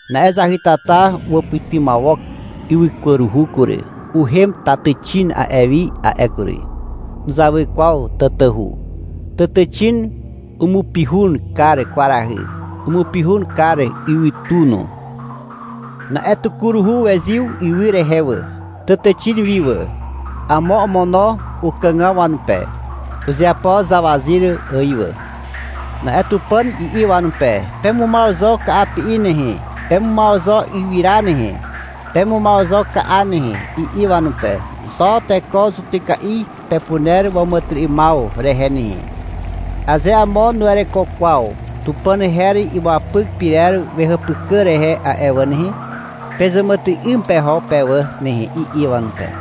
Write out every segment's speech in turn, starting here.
Na'e zahytata uwàpytymawok ywykwaruhu kury. Uhem tàtàxin a'e wi a'e kury. Nuzawy kwaw tatahu. Tàtàxin umupihun kar kwarahy. Umupihun kar ywytu no. Na'e tukuruhu wezyw ywy rehe wà, tàtàxin wi wà. Amo omono ukàgaw wanupe. Uzeapo zawazyr ài wà. Na'e Tupàn i'i wanupe. — Pemumaw zo ka'api'i nehe, pemumaw zo ywyra nehe. Pemumaw zo ka'a nehe, i'i wanupe. — Xo teko zutyka'i pepuner wàmàtyry'ymaw rehe nehe. Aze amo nuwereko kwaw Tupàn her imuapyk pyrer wehàpykà rehe a'e wà nehe, pezàmàtyry'ym peho pe wà nehe, i'i wanupe.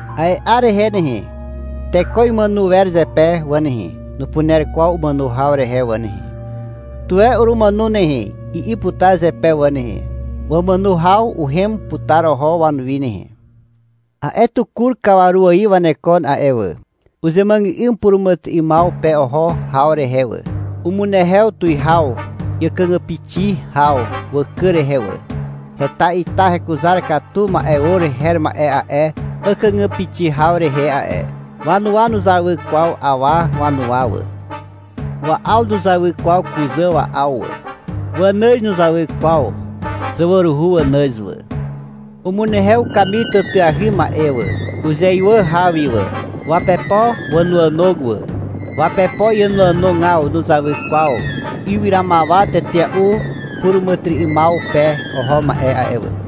A'e 'ar rehe nehe, teko imàno wer zepe wà nehe. Nupuner kwaw umàno haw rehe wà nehe. — Tuwe urumàno nehe, i'i putar zepe wà nehe. Wamàno haw uhem putar oho wanuwi nehe. A'e tukur kawaru ài wanekon a'e wà. Uzemuàgà'ym puràmàtyry'ymaw pe oho haw rehe wà. Umunehew tuwihaw àkàgàpixi haw wàkàg rehe wà. Heta ita hekuzar katu ma'e or her ma'e a'e àkàgàpixi haw rehe a'e. Wanuwa nuzawy kwaw awa wanuwa wà. Wa'aw nuzawy kwaw kuzà wa'aw wà. Wanàz nuzawy kwaw zawaruhu wanàz wà. Umunehew ukamir tàtàahy ma'e wà, uzeywà haw wi wà. Wapepo wànoànog wà. Wapepo iànoànogaw nuzawy kwaw ywyramawa tetea'u puràmàtyry'ymaw pe oho ma'e a'e wà.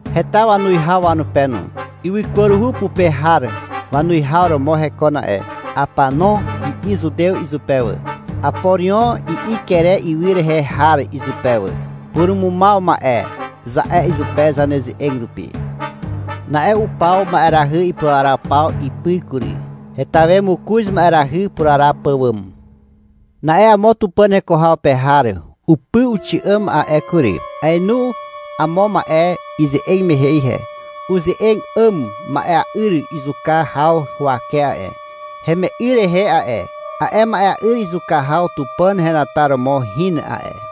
Heta wanuwihaw wanupe no. Ywykwaruhu pupe har wanuwihaw romo hekon a'e. — Apanon, i'i Zutew izupe wà. — Aporion, i'i Kere ywy rehe har izupe wà. — Purumumaw ma'e, za'e izupe zaneze'eg rupi. Na'e upaw ma'erahy ipuraraw paw ipy kury. Heta we mokoz ma'erahy puraraw pàwàm. Na'e amo Tupàn heko haw pe har upy uxi'àm a'e kury. Aenu amo ma'e ize'eg mehe ihe. Uze'eg 'àm ma'ea'yr zuka haw huwake a'e, heme'y rehe a'e. A'e ma'ea'yr zuka haw Tupàn henataromo hin a'e.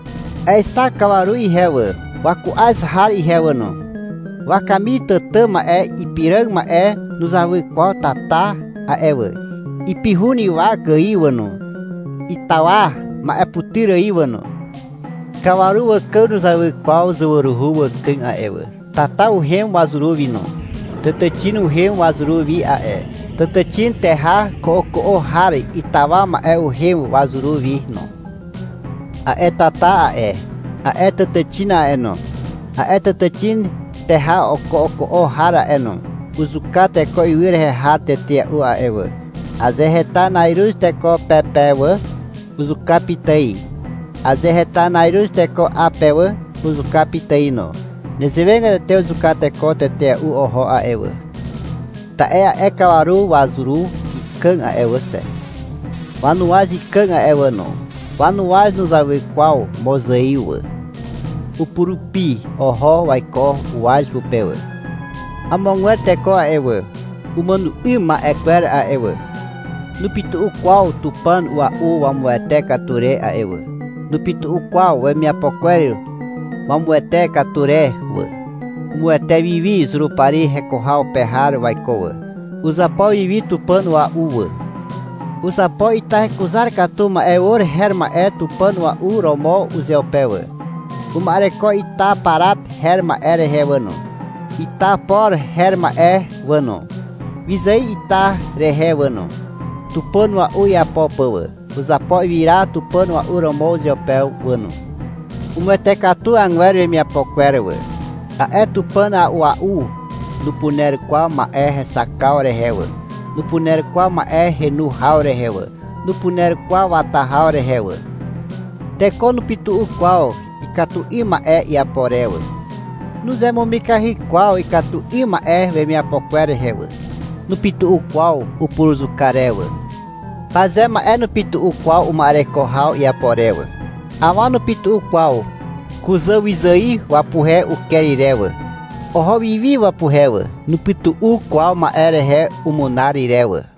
Aexak kawaru ihe wà, waku'az har ihe wà no. Wakamir tàtà ma'e ipiràg ma'e nuzawy kwaw tata a'e wà. Ipihun ywak ài wà no. Itawa ma'eputyr ài wà no. Kawaru wàkàg nuzawy kwaw zawaruhu wàkàg a'e wà. Tata uhem wazuru wi no. Tàtàxin uhem wazuru wi a'e. Tàtàxin teha ko'oko'o har itawa ma'e uhem wazuru wi no. A'e tata a'e, a'e tàtàxin a'e no, a'e tàtàxin teha ko'oko'o har a'e no, uzuka teko ywy rehe har tetea'u a'e wà. Aze heta na'iruz teko pe pe wà, uzuka pitài. Aze heta na'iruz teko 'a pe wà, uzuka pitài no. Nezewegatete uzuka teko tetea'u oho a'e wà. Ta'e a'e kawaru wazuru ikàg a'e wà xe. Wanuwaz ikàg a'e wà no. Wanuwaz nuzawy kwaw mozaiw wà. Upurupi oho waiko uwaz pupe wà. Amogwer teko a'e wà, umàno 'ym ma'e kwer a'e wà, nupytu'u kwaw tupàn a'ua'u wamuwete katu re a'e wà. Nupytu'u kwaw wemiapo kwer wamuwete katu re wà. Umuwete wi wi Zurupari heko haw pe har waiko wà. Uzapo wi wi tupàn ua'u wà. Uzapo ita hekuzar katu ma'e or her ma'e tupàn ua'u romo uzeupe wà. Uma'ereko ita parat her ma'e rehe wà no, ita poro her ma'e wà no, wyzài ita rehe wà no, tupàn ua'u iapo pà wà. Uzapo ywyra tupàn ua'u romo uzeupe wà no. Umuwete katu agwer wemiapo kwer wà. A'e tupàn a'ua'u nupuner kwaw ma'e hexakaw rehe wà. Nupuner kwaw ma'e henu haw rehe wà. Nupuner kwaw wata haw rehe wà. Teko nupytu'u kwaw ikatu 'ym ma'e iapo re wà. Nuzemumikahy kwaw ikatu 'ym ma'e wemiapo kwer rehe wà. Nupytu'u kwaw upuruzuka re wà. Paze ma'e nupytu'u kwaw uma'ereko haw iapo re wà. Awa nupytu'u kwaw kuzàwyzài wapuhe uker ire wà. Oho wiwi wapuhe wà. Nupytu'u kwaw ma'e rehe umunar ire wà.